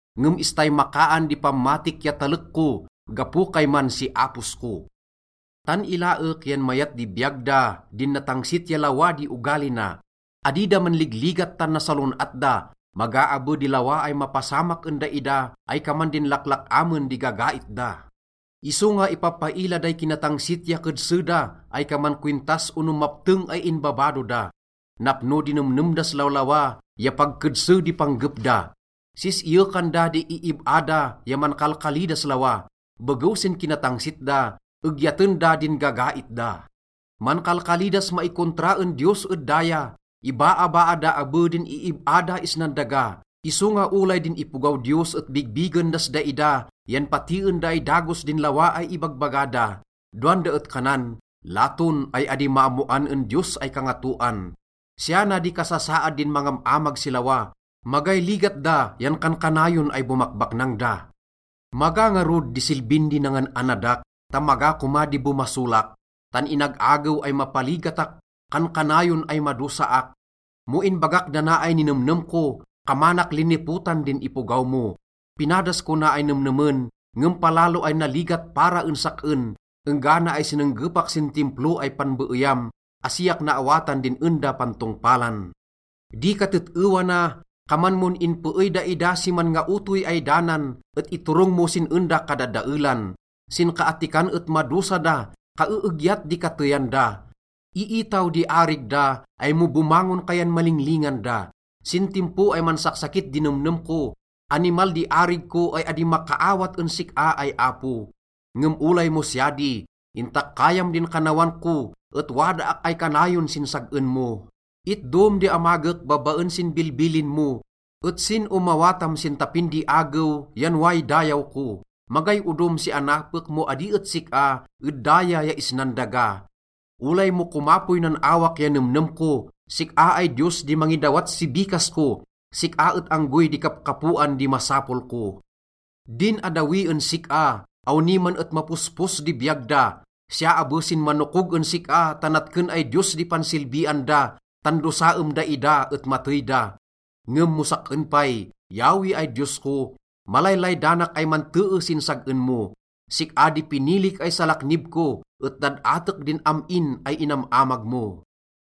Ngem istay makaan di pammatik ya talek ko gapo kayman si apos ko. Tan ilaek yan mayat di biyag da, din natangsit ya lawa di ogali na. Adi da manligligat tan nasalon-at da. Maga abe di lawa ay mapasamak en daida ay kaman din laklak-amen di gagait da. Isonga ipapaila day kinatangsit ya kedse da ay kaman kowintas ono mapteng ay inbabado da. Napno di nemnem das lawlawa ya pag kedse di panggep da. Sis-iyekan da di iib-a da ya mankalkali das lawa. Begew sin kinatangsit da, egyaten da din gagait da. Mankalkali das maikontra en Diyos ed daya, ibaabaa da abe din iib-a da isnan daga. Isonga olay din ipogaw Diyos et bigbigen das daida yan patien da ay dagos din lawa ay ibagbaga da. Dowan da et kanan, “Laton ay adi maammoan en Diyos ay Kangatoan.” Siya na di kasasaad din mangam-amag si lawa: magay ligat da yan kankanayon ay bomakbaknang da. Maga ngarud di silbin di nangan-annadak ta maga koma di bomasolak, tan inag-agew ay mapaligatak, kankanayon ay madosaak. Mo inbagak dana ay ninemnem ko, kamanak linipotan din ipogaw mo. Pinadas ko na ay nemnemen, ngem palalo ay naligat para en sak-en, enggana ay sinenggepak sin Timplo ay panbeeyam. Asiak naawatan din en da pantongpalan. Di katet-ewa na, kaman mon inpeey daida si manngaotoy ay danan et inturong mo si en da kadadaelan. Sinkaattikan et madosa da, kaeegyat di kateyan da. Iitaw di arig da ay mo bomangon ka yan malinglingan da. Sin timpo ay mansaksakit din nemnem ko, Animal di arig ko ay adi makaawat en sik-a ay Apo. Ngem olay mo siya di, intakkayam din kannawan ko et wadaak ay kanayon sin sag-en mo. Itdom di amagek babaen sin bilbilin mo, et sin omawatam sin tapin di agew yan way dayaw ko. Magay odom si anapek mo adi et sik-a ed daya ya isnan daga. Olay mo komapoy nan awak ya nemnem ko, sik-a ay Diyos di mangidawat si bikas ko, sik-a et anggoy di kapkapoan di masapol ko. Din addawi en sik-a, awni man et mapospos di biyag da. Siya abe sin manokog en sik-a ta natken ay diyos di pansilbian da, Tan dosaem daida et matey da. Ngem mo sak-en pay, Yahweh ay Diyos ko, malaylaydanak ay mantee sin sag-en mo. Sik-a di pinilik ay salaknib ko et dad-atek din am-in ay inam-amag mo.